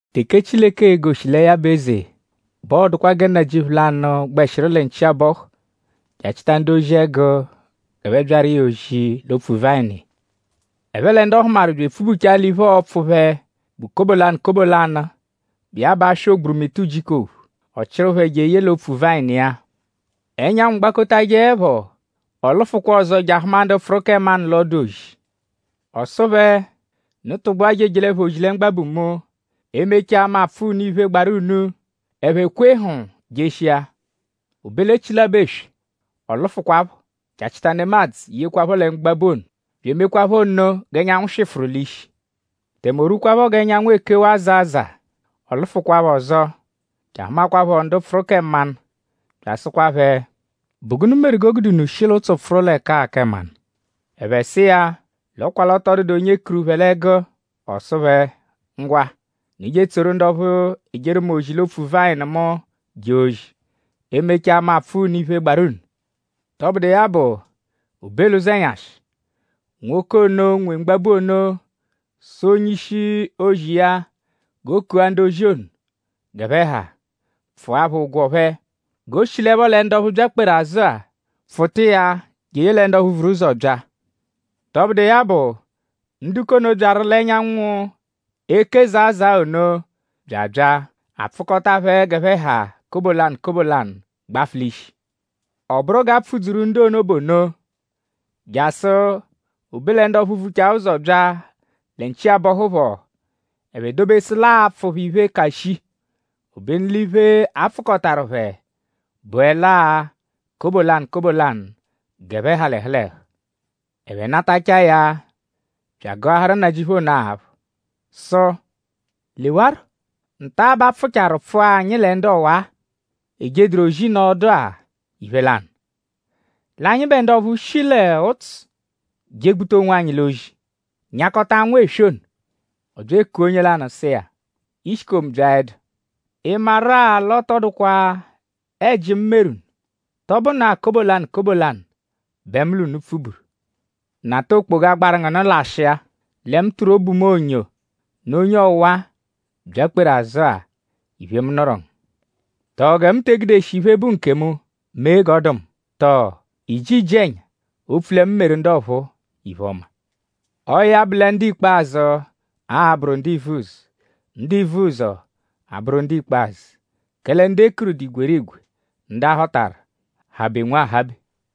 “Teke Chileke e-goshi lẹ ya bụ eze bẹ ọo-dụkwa gẹ nnajịuphu lanụ, gbẹshiru lẹ nchi abọhu je achịta ndu-ozi ẹgu g'ẹphe byaru iya ozi l'opfu-vayịnu iya. Ẹphe lẹ ndu ọ hụmaru bya epfubuchaa l'iphe, ọo-pfụ phẹ bụ kobo lanụ kobo lanụ, bụ iya bụ aswa ogburumịta ujiku ophu; ọ chịru phẹ jeye l'opfu-vayịnu iya. Ẹnyanwu gbakotajẹepho; ọ lụfukwa ọzo je ahụma ndu pfụru kẹ mmanụ l'ọdu-ozi. Ọ sụ phẹ: ‘Unu tụgbua je ejelẹpho ozi lẹ mgbabu mu. E -mechaa; mu apfụa unu iphe, gbaru unu.’ Ẹphe kwee hm jeshia. O be l'echilabọ eswe; ọ lụfukwapho je achịta nemadzụ yekwaphọ lẹ mgbabu ono; bya emekwaaphọ nno g'ẹnyanwu swịfuru l'ishi. Tẹme o rwukwaaphọ g'ẹnyanwu ekewaa zaa zaa; ọ lụfukwapho ọzo je ahụmakwapho ndu pfụru kẹ mmanụ; bya asụkwa phẹ: ‘?Bụ gụnu meru g'o gude unu shi l'ụtsu pfụru l'ẹka-a kẹ mmanụ?’ Ẹphe sụ iya l'ọ kwa l'ọ tọ dụdu onye kuru phẹ l'ẹgu. Ọ sụ phẹ: ‘Ngwa; unu je etsoru ndu ọphu ejeru mu ozi l'opfu-vayịnu mu jee ozi. E -mechaa mu apfụa unu iphe, gbarụ unu.’ “Tọbudu iya bụ; o be l'ụzenyashi; nwoke ono, nwe mgbabu ono sụ onye-ishi-ozi iya g'o kua ndu-ozi ono g'ẹphe ha; pfụa phẹ ụgwo phẹ. G'o shilẹpho lẹ ndu ọphu byakperu azụ-a pfụta iya jeye lẹ ndu ọphu vuru ụzo bya. Tọbudu iya bụ; ndu k'ono, byaru l'ẹnyanwu eke zaa zaa ono bya abya. A pfụkota phẹ g'ẹphe ha kobo lanụ kobo lanụ gbafụ l'ishi. Ọ bụru g'a pfụ-dzuru ndu ono bụ ono; jasụ o be lẹ ndu ọphu vuchaa ụzo bya lẹ nchi abọhu phọ; ẹphe dobesu l'aa-pfụ phẹ iphe, ka shii. Obenu l'iphe, a pfụkotaru phẹ bụele-a kobo lanụ kobo lanụ g'ẹphe ha l'ẹhu l'ẹhu. Ẹphe natachaa ya bya agụaharu nnajịuphu ono aphụ sụ: ‘Lewarọ; nta-a bẹ a pfụcharu pfụa anyi lẹ ndu ọwa-a, ejeduru ozi nọo ọdu-a iphe lanụ; l'anyịbe ndu ọphu shi l'ụtsu jegbuta onwanyi l'ozi; nyakọta anwụ eswe ono.’ Ọ bya ekua onye lanụ sụ iya: ‘Ishikomu byaẹdu.?Ị maru-a l'ọ tọ dụkwa ẹji, mu meru unu.?Tọ bụnaa kobo lanụ kobo lanụ bẹ mu l'unu pfuburu? Nata okpoga, gbaru ngu nụ lashịa; lẹ mu tụru obu mu onyo nụ onye ọwa-a, byakperu azụ-a iphe, mu nụru ngu. ?Tọo gẹ mu te egudeshi iphe, bụ nkemu mee g'ọ dụ mu? Tọo?iiji iji-ẹnya opfu lẹ mu meru ndu ọphuu iphe-ọma?’ “Ọo ya bụ lẹ ndu ikpazụ a-bụru ndu ivuzọ; ndu ivuzọ abụru ndu ikpazụ. Kẹle ndu e kuru dụ igwerigwe; ndu a họtaru habe nwahabe.”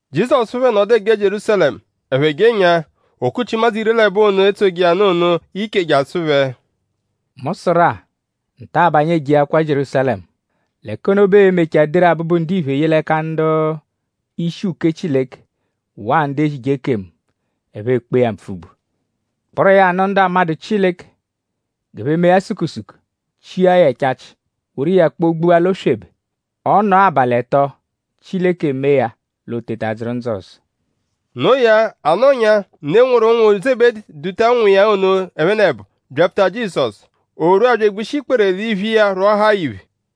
Jizọsu phẹ nọdu eje Jierúsalẹmu. Ẹphe jenyaa; o kuchi ụmadzu iri l'ẹbo ono, etsoje iya nụ ono iche je asụ phẹ: “Mu sụru-a; nta-a bẹ anyi ejeakwa Jierúsalẹmu. L'ẹka ono bẹ ee-mechaa deru Abụbu-Ndiphe ye l'ẹka ndu-ishi uke Chileke waa ndu ezije ekemu. Ẹphe ekpee ya mpfugbu; kpụru iya nụ ndu 'amadụ Chileke g'ẹphe mee ya sukusuku; chia ya ẹchachi; woru iya kpọ-gbua l'oswebe. Ọ -nọo abalị ẹto; Chileke emee ya l'o teta dzụru ndzụ ọzo.” Noo ya; a nọnyaa; ne, nwụru ụnwu Zebedi duta ụnwu iya ono ẹphenebo byapfuta Jizọsu. O rwua bya egbushi ikpere l'iphu iya rwọahaa ya iphe.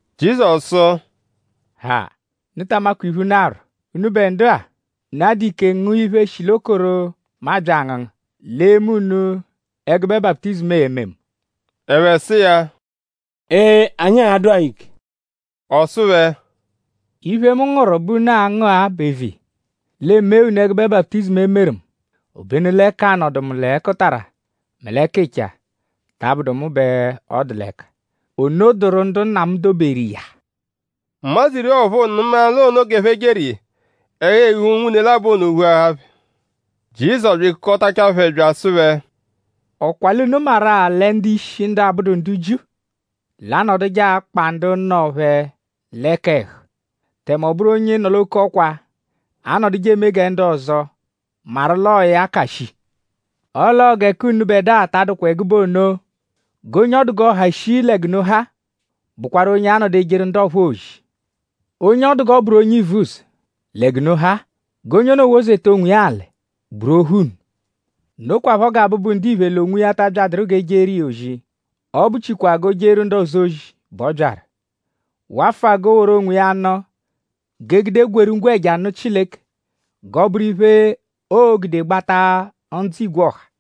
Jizọsu sụ: “Ha! Unu ta amakwa iphe, unu arwọ; unubẹ ndu-a.?Unu a-dụ ike ngụa iphe, shi l'okoro, mu abya angụngu; l'e mee unu ẹgube baputizimu e-me mu?” Ẹphe sụ iya: “Ee! Anyi a-dụ-a ike.” Ọ sụ phẹ: “Iphe, mu ngụru bẹ unu a-ngụ-a bụ eviya; l'e mee unu ẹgube baputizimu, e meru mu; obenu lẹ k'anọdu mu l'ẹkutara mẹ l'ẹkicha ta abụdu mu bẹ ọ dụ l'ẹka. Ono dụru ndu Nna mu doberu iya.” Ụmadzu iri ọphuu nụma l'onoo g'ẹphe jeru iya; ẹhu-eghu unwune labọ ono ghuahaa phẹ. Jizọsu bya ekukọtachaa phẹ bya asụ phẹ: “?Ọ kwa l'unu maru-a lẹ ndu-ishi ndu abụdu ndu Jiu; l'anọduje akpa ndu nọ phẹ l'ẹka ẹhu; tẹme ọ bụru onye nọ-l'oke-ọkwa anọduje eme gẹ ndu ọzo maru l'ọo ya ka shii. Ọle ọo gẹ k'unubẹdua ta adụkwa ẹgube ono; g'onye ọ dụ g'ọ ha shii lẹ g'unu ha; bụkwaru onye a-nọdu ejeru ndu ọphuu ozi. Onye ọ dụ g'ọ bụru onye ivuzọ lẹ g'unu ha-a; g'onye ono wozeta onwiya alị; bụru ohu unu. Nokwaphọ gẹ Abụbu-Ndiphe l'onwiya ta abyadụru g'e jeru iya ozi; ọ bụchikwaa g'o jeru ndu ọzo ozi bẹ ọ byaru; wafụa g'o woru onwiya nụ; g'e gude gweeru ngwẹja nụ Chileke g'ọ bụru iphe, oo-gude gbata ndzụ igwe ọha.”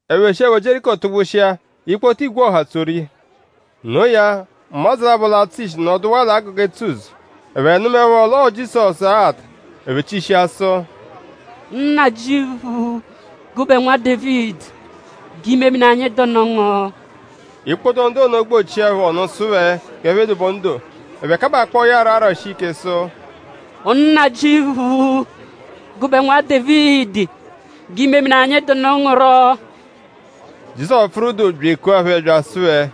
Ẹphe shiẹpho Jieriko tụgbushia; ikpoto igwe ọha tsoru iya. Noo ya; ụmadzu labọ, l'atsụ ishi nọduwaa l'agụga etsu-ụzo. Ẹphe nụmaepho l'ọo Jizọsu aghata; ẹphe chishia sụ: “Nnajịuphu; gụbe Nwa Dévidi; g'imemini anyị dụnu ngu!” Ikpoto ndu ono gbọchia phẹ ọnu sụ phẹ g'ẹphe dobe ọnu doo. Ẹphe kabakpọo ya rọ arashi ike sụ: “Nnajịuphu; gụbe Nwa Dévidi; g'imemini anyi dụ ngu rọ!” Jizọsu pfụru doo bya ekua phẹ bya asụ phẹ: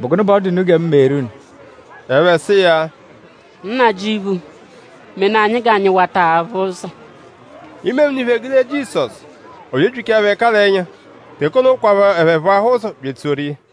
“?Bụ gụnu bẹ ọ dụ unu gẹ mu meeru unu?” Ẹphe sụ iya: “Nnajịuphu; menaa anyi g'anyi wata aphụ ụzo.” Imemini phẹ gude Jizọsu. Ọ bya ebyichaa phẹ ẹka l'ẹnya. Teke ono kwaphọ ẹphe phụahaa ụzo bya etsoru iya.